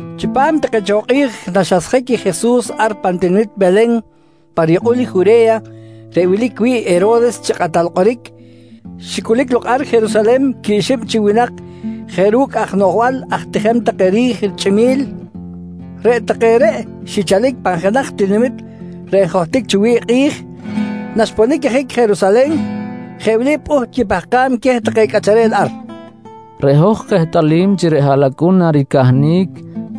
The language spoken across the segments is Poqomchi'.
Chipam take cho kꞌi̱j naxasjic i Jesus ar pan tinamit Welen pa riyukꞌul i Jure̱ya reꞌ wilic wi̱ꞌ i Hero̱res chi kꞌatal kꞌoric, xicꞌulic lok ar Jerusalen quib xib chi winak jeꞌ ru̱cꞌ aj noꞌjbal aj tijem take ri̱j chꞌimi̱l. Reꞌ take reꞌ xichalic pan jenaj tinamit reꞌ njohtic cho wi̱ꞌ i kꞌi̱j. Naxiponic ajic Jerusalen, jeꞌ wili pꞌuht quipahkam queh take cꞌacharel ar: «Reꞌ hoj kehtꞌalim chi reꞌ haꞌlacꞌun naricahnic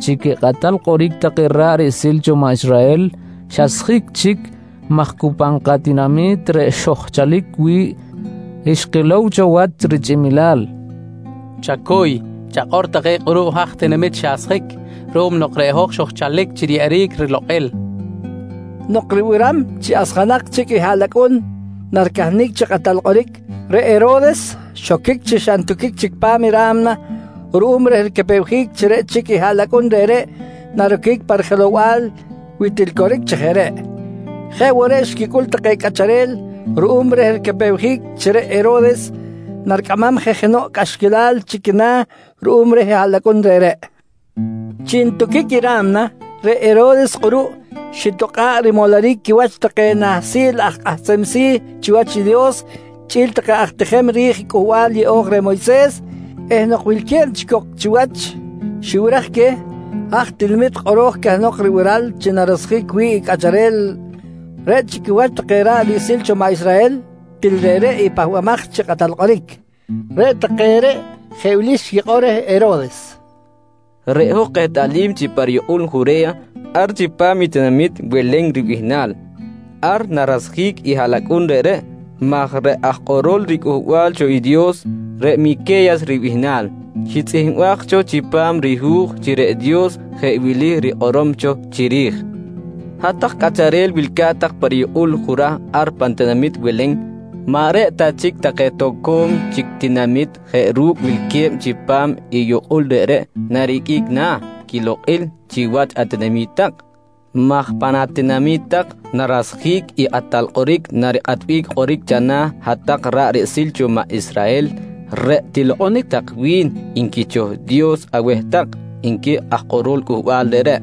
chi quikꞌatal kꞌoric take ra̱ꞌ riꞌsil cho maꞌ Israhel xasjic chic maj cu pan katinami̱t reꞌ xojchalic wi̱ꞌ xkilow cho wach richꞌimilal. Chacuy, chakꞌor tak keh kꞌuruꞌ haj tinamit xasjic ruꞌum nok reꞌ hoj xojchalic chi riyeꞌeric rilokꞌil, nqui take. Nok ribiram chi asjanak chic i haꞌlacꞌun naricahnic chi kakꞌatal kꞌoric, reꞌ Hero̱res xoquic chi xa ntuquic chic pa ra̱mna ruꞌum reh ricapewjic chi reꞌ chic i haꞌlacꞌun reꞌreꞌ naroquic pa rijelow-bal wi til coric chi jeꞌ reꞌ. Jeꞌ woꞌ reꞌ xquicꞌul take cꞌacharel ruꞌum reh ricapewjic chi reꞌ Hero̱res naricꞌamam je jenoꞌ cꞌaxquilal chi quina̱ ruꞌum reh i haꞌlacꞌun reꞌreꞌ. Chi ntuquic i ra̱mna, reꞌ Hero̱res kꞌuruꞌ xitakꞌa̱ꞌ rimoloric quiwach take nahsil aj kꞌahsem si̱ chiwach i Dios chꞌi̱l take aj tijem ri̱j Cꞌuhbal Yeꞌo̱j reh Moyses eh nok wilque̱b chic cok chiwach, xibiraj queh haj tinamit kꞌoro̱j cahnok ribiral chi narasjic wi̱ꞌ i cꞌacharel reꞌ chi quiwach take ra̱ꞌ riꞌsil cho maꞌ Israhel til reꞌreꞌ i Pahbamaj chi Kꞌatal Kꞌoric. Reꞌ take reꞌ jeꞌ wili xquikꞌor reh Hero̱res: «Reꞌ hoj kehtꞌalim chi pa riyukꞌul Jure̱ya ar chipam i tinamit Welen ribihnal, ar narasjic i haꞌlacꞌun reꞌreꞌ maj reꞌ aj kꞌorol riCꞌuhbal cho i Dios, reꞌ Mique̱yas ribihnal, xitzꞌihmbaj cho chipam rihu̱j chi reꞌ Dios jeꞌ wili rikꞌorom cho chiri̱j: “Hat-tak cꞌacharel wilca̱t tak pa riyukꞌul Jurah ar pan tinamit Welen, maꞌ reꞌ ta chic take toco̱m chic tinamit jeꞌ ru̱cꞌ wilque̱b chipam i yukꞌul reꞌreꞌ nariqꞌuic na̱ quilokꞌil chiwach atinami̱t tak, maj pan atinami̱t tak narasjic i kꞌatal kꞌoric narikꞌatbic kꞌoric chana̱ hat-tak ra̱ꞌ riꞌsil cho maꞌ Israhel reꞌ tilokꞌonic tak wi̱n nqui cho Dios aweh tak, nqui aj kꞌorol cꞌuhbal reꞌreꞌ, nqui take reh.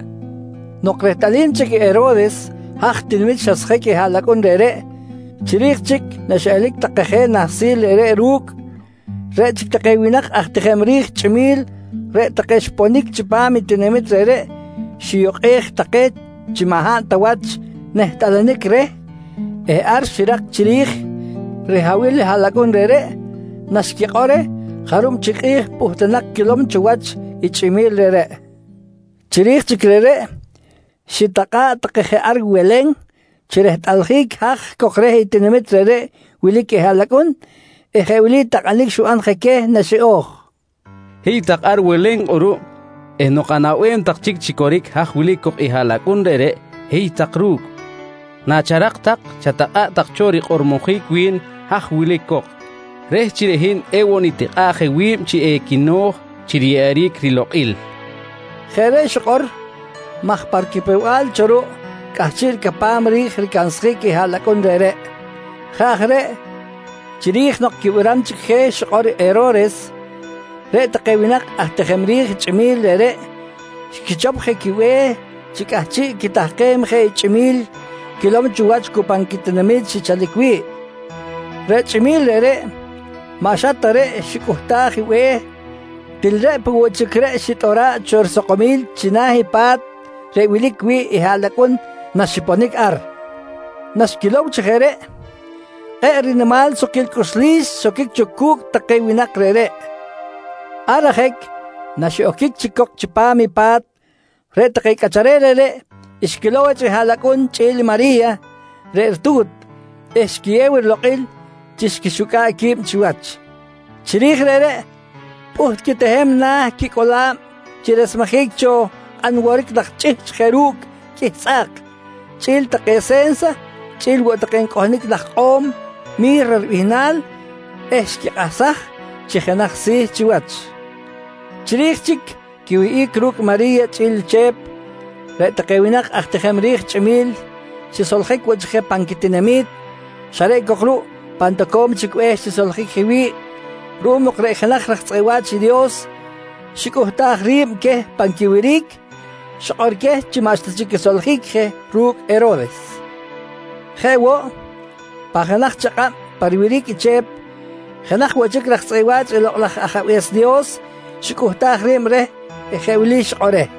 Nok rehtꞌalim chic i Hero̱res haj tinamit xasjic i haꞌlacꞌun reꞌreꞌ, chiri̱j chic naxiꞌelic take je nahsil reꞌreꞌ ru̱cꞌ, reꞌ chic take winak aj tijem ri̱j chꞌimi̱l reꞌ take xiponic chipam i tinamit reꞌreꞌ xiyukꞌej take chi maꞌ hab ta wach nehtꞌalanic reh eh ar xirak chiri̱j rihabil i haꞌlacꞌun reꞌreꞌ naxquikꞌor reh jarub chic kꞌi̱j pꞌuhtunak quilom cho wach i chꞌimi̱l reꞌreꞌ. Chiri̱j chic reꞌreꞌ, xitakꞌa̱ꞌ take je ar Welen chi rehtꞌaljic haj cok reh tinamit reꞌreꞌ wilic i haꞌlacꞌun eh jeꞌ wili takꞌanic xiban je queh naxiꞌo̱j: «Hiy tak ar Welen kꞌuruꞌ eh nok anaꞌbem tak chic chi coric haj wilic cok i haꞌlacꞌun reꞌreꞌ, hiy tak ru̱cꞌ. Nacharak tak chatakꞌa̱ꞌ tak cho rikꞌormojic wi̱n haj wilic cok, reh chi reꞌ hin ewoꞌ nitikꞌa̱ꞌ je wi̱b chi equino̱j chi riyeꞌeric rilokꞌil, nqui je Hero̱res. Jeꞌ reꞌ xikꞌor maj pa ricapew-bal cho ruꞌ cꞌahchiꞌ ricapam ri̱j ricansjic i haꞌlacꞌun reꞌreꞌ. Jeꞌ aj reꞌ chiri̱j nok quibiram chic je xikꞌor Hero̱res, reꞌ take winak aj tijem ri̱j chꞌimi̱l reꞌreꞌ xquichop je quibe̱h chi cꞌahchiꞌ quitahkem je i chꞌimi̱l quilom cho wach cu pan quitinami̱t xichalic wi̱ꞌ. Reꞌ chꞌimi̱l reꞌreꞌ maꞌ xa ta reꞌ xicꞌuhtaj i be̱h, til reꞌ peꞌ woꞌ chic reꞌ xitꞌora̱ꞌ cho risakomil china̱ i pa̱t reꞌ wilic wi̱ꞌ haꞌlacꞌun naxiponic ar. Naxquilow chi jeꞌ reꞌ, kꞌe̱ꞌ rinimal sukquil cꞌuxlis xoquic cho cu̱cꞌ take winak reꞌreꞌ. Ar ajic naxiꞌoquic chic cok chipam i pa̱t, reꞌ take cꞌacharel reꞌreꞌ xquilow wach i haꞌlacꞌun chꞌi̱l i Mari̱ya reꞌ ritu̱t eh xquiyew rilokꞌil chi xquixucꞌa̱ꞌ qui̱b chiwach. Chiri̱j reꞌreꞌ, pꞌuht quitehem na̱ quicꞌola̱b chi resmejic cho kꞌan woric laj chꞌihchꞌ jeꞌ ru̱cꞌ qꞌuih tzꞌa̱k, chꞌi̱l take se̱nsa chꞌi̱l woꞌ take ncꞌohnic laj ikꞌo̱m Mi̱ra ribihnal eh xquikꞌahsaj chi jenaj si̱ chiwach. Chiri̱j chic quiwihꞌic ru̱cꞌ Mari̱ya chꞌi̱l Chep, reꞌ take winak aj tijem ri̱j chꞌimi̱l xisoljic woꞌ chic je pan quitinami̱t, xa reꞌ cok ruꞌ pan toco̱m chic be̱h xisoljic je wi̱ꞌ ruꞌum nok reꞌ jenaj raj tzꞌeꞌ wa̱ch i Dios xicꞌuhtaj ri̱b queh pan quiwiric, xikꞌor queh chi maꞌxta chic quisoljic je ru̱cꞌ Hero̱res. Jeꞌ woꞌ, pan jenaj chakꞌab pa riwiric i Chep, jenaj woꞌ chic raj tzꞌeꞌ wa̱ch i Lokꞌ laj Ajabe̱s Dios xicꞌuhtaj ri̱b reh eh jeꞌ wili xikꞌor reh: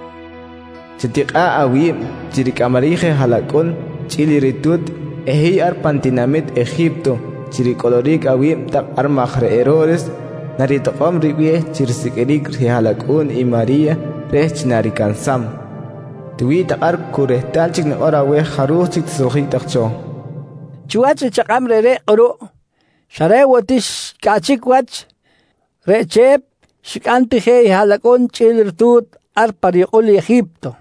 «Chatikꞌa̱ꞌ awi̱b chi ricꞌamaric je haꞌlacꞌun chꞌi̱l i ritu̱t eh hiy ar pan tinamit Eji̱pto chi ricꞌoloric awi̱b tak ar maj reꞌ Hero̱res naritokꞌom ribe̱h chi risiqꞌuiric rihaꞌlacꞌu̱n i Mari̱ya reh chi naricansam. Tiwi̱ꞌ tak ar cu rehtal chic nikꞌor aweh jaruj chic tisoljic tak cho, nqui reh. Chiwach i chakꞌab reꞌreꞌ kꞌuruꞌ, xa reꞌ woꞌ ti xcꞌaꞌchic wach, reꞌ Chep xicꞌam ti je i haꞌlacꞌun chꞌi̱l i ritu̱t ar pa riyukꞌul i Eji̱pto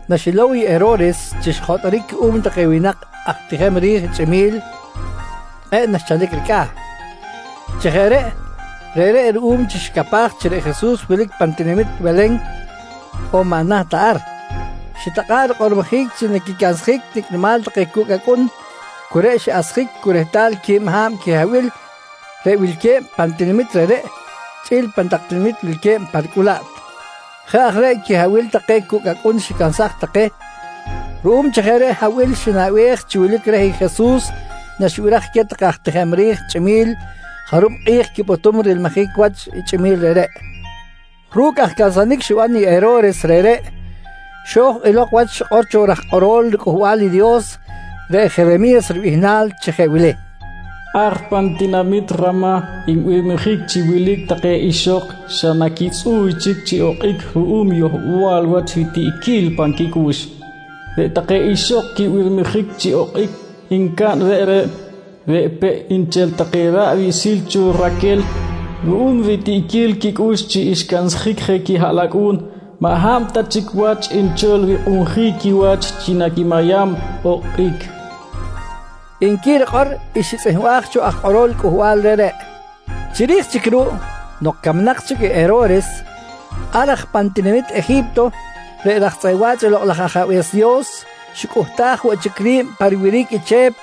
Naxilow i Hero̱res chi xjotꞌoric cuꞌum take winak aj tijem ri̱j chꞌimi̱l, kꞌe̱ꞌ naxchalic ricꞌa̱. Chi jeꞌ reꞌ, reꞌreꞌ ruꞌum chi xicapaj chi reꞌ Jesus wilic pan tinamit Welen on maꞌ naht ta ar, xitakꞌa̱ꞌ rikꞌormojic chi naquicansjic nicꞌ nimal take cucꞌ acꞌun cu reꞌ xiꞌasjic cu rehtal quib ha̱b quihabil reꞌ wilque̱b pan tinamit reꞌreꞌ chꞌi̱l pan tak tinamit wilque̱b pa ricꞌulaꞌt. Jeꞌ aj reꞌ quihabil take cucꞌ acꞌun xicansaj take ruꞌum chi jeꞌ reꞌ habil xinaꞌbej chi wilic reh i Jesus naxibiraj queh take aj tijem ri̱j chꞌimi̱l jarub kꞌi̱j quipꞌutum rilmijic wach i chꞌimi̱l reꞌreꞌ. Ru̱cꞌ aj cansanic xiban i Hero̱res reꞌreꞌ, xo̱j elok wach i xikꞌor cho raj kꞌorol riCꞌuhbal i Dios reꞌ Jeremi̱yas ribihnal chi jeꞌ wili: “Ar pan tinamit Ramah nbirmijic chi wilic take ixok xa naquitzꞌu̱y chic chi okꞌic ruꞌum yohbal wach ritiꞌquil pan quicꞌux. Reꞌ take ixok quibirmijic chi okꞌic ncaꞌn reꞌreꞌ, reꞌ peꞌ nchel take ra̱ꞌ riꞌsil cho Raquel. Ruꞌum ritiꞌquil quicꞌux chi xcansjic je quihaꞌlacꞌu̱n, maꞌ hab ta chic wach nchol rikꞌunjic quiwach chi naquimayam okꞌic, nqui rikꞌor i xitzꞌihmbaj cho aj kꞌorol cꞌuhbal reꞌreꞌ. Chiri̱j chic ruꞌ nok camnak chic i Hero̱res, ar aj pan tinamit Eji̱pto, reꞌ raj tzꞌeꞌ wa̱ch i Lokꞌ laj Ajabe̱s Dios xicꞌuhtaj woꞌ chic ri̱b pa riwiric i Chep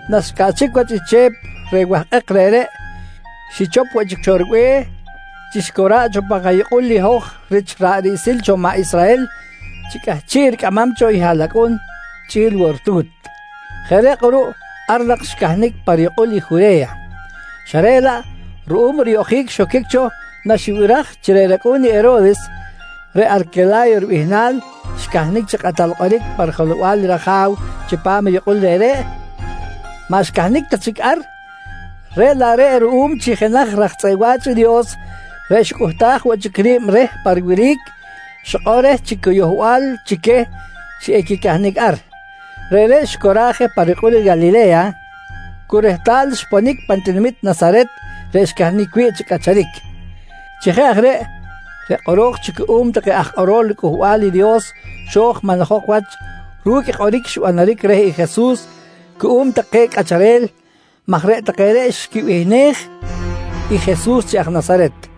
Naxcꞌaꞌchic wach i Chep reh wahkꞌek reꞌreꞌ, xichop woꞌ chic cho ribe̱h chi xicora̱ꞌ cho pan kayukꞌul i hoj rich ra̱ꞌ riꞌsil cho maꞌ Israhel chi cꞌahchiꞌ ricꞌamam cho i haꞌlacꞌun chꞌi̱l woꞌ i ritu̱t. Jeꞌ reꞌ kꞌuruꞌ ar nak xcahnic pa riyukꞌul i Jure̱ya, xa reꞌ laꞌ ruꞌum riyoꞌjic xoquic cho naxibiraj chi reꞌ racꞌu̱n i Hero̱res, reꞌ Arquela̱yo ribihnal xcahnic chi kꞌatal kꞌoric pa rijelow-bal i raja̱w chipam i yukꞌul reꞌreꞌ, maꞌ xcahnic ta chic ar, reꞌ laꞌ reꞌ ruꞌum chi jenaj raj tzꞌeꞌ wa̱ch i Dios reꞌ xicꞌuhtaj woꞌ chic ri̱b reh pa riwiric xikꞌor reh chi cu yohbal chi queh chi equicahnic ar, reꞌreꞌ xicora̱ꞌ je pa riyukꞌul i Calile̱ya cu rehtal xponic pan tinamit Nasaret reꞌ xcahnic wi̱ꞌ chi cꞌacharic. Chi jeꞌ aj reꞌ, reꞌ kꞌoro̱j cho cuꞌum take aj kꞌorol riCꞌuhbal i Dios xo̱j manlajok wach ru̱cꞌ i kꞌoric xbanaric reh Jesus cuꞌum take cꞌacharel maj reꞌ take reꞌ xquibihnej i Jesus chi aj Nasaret.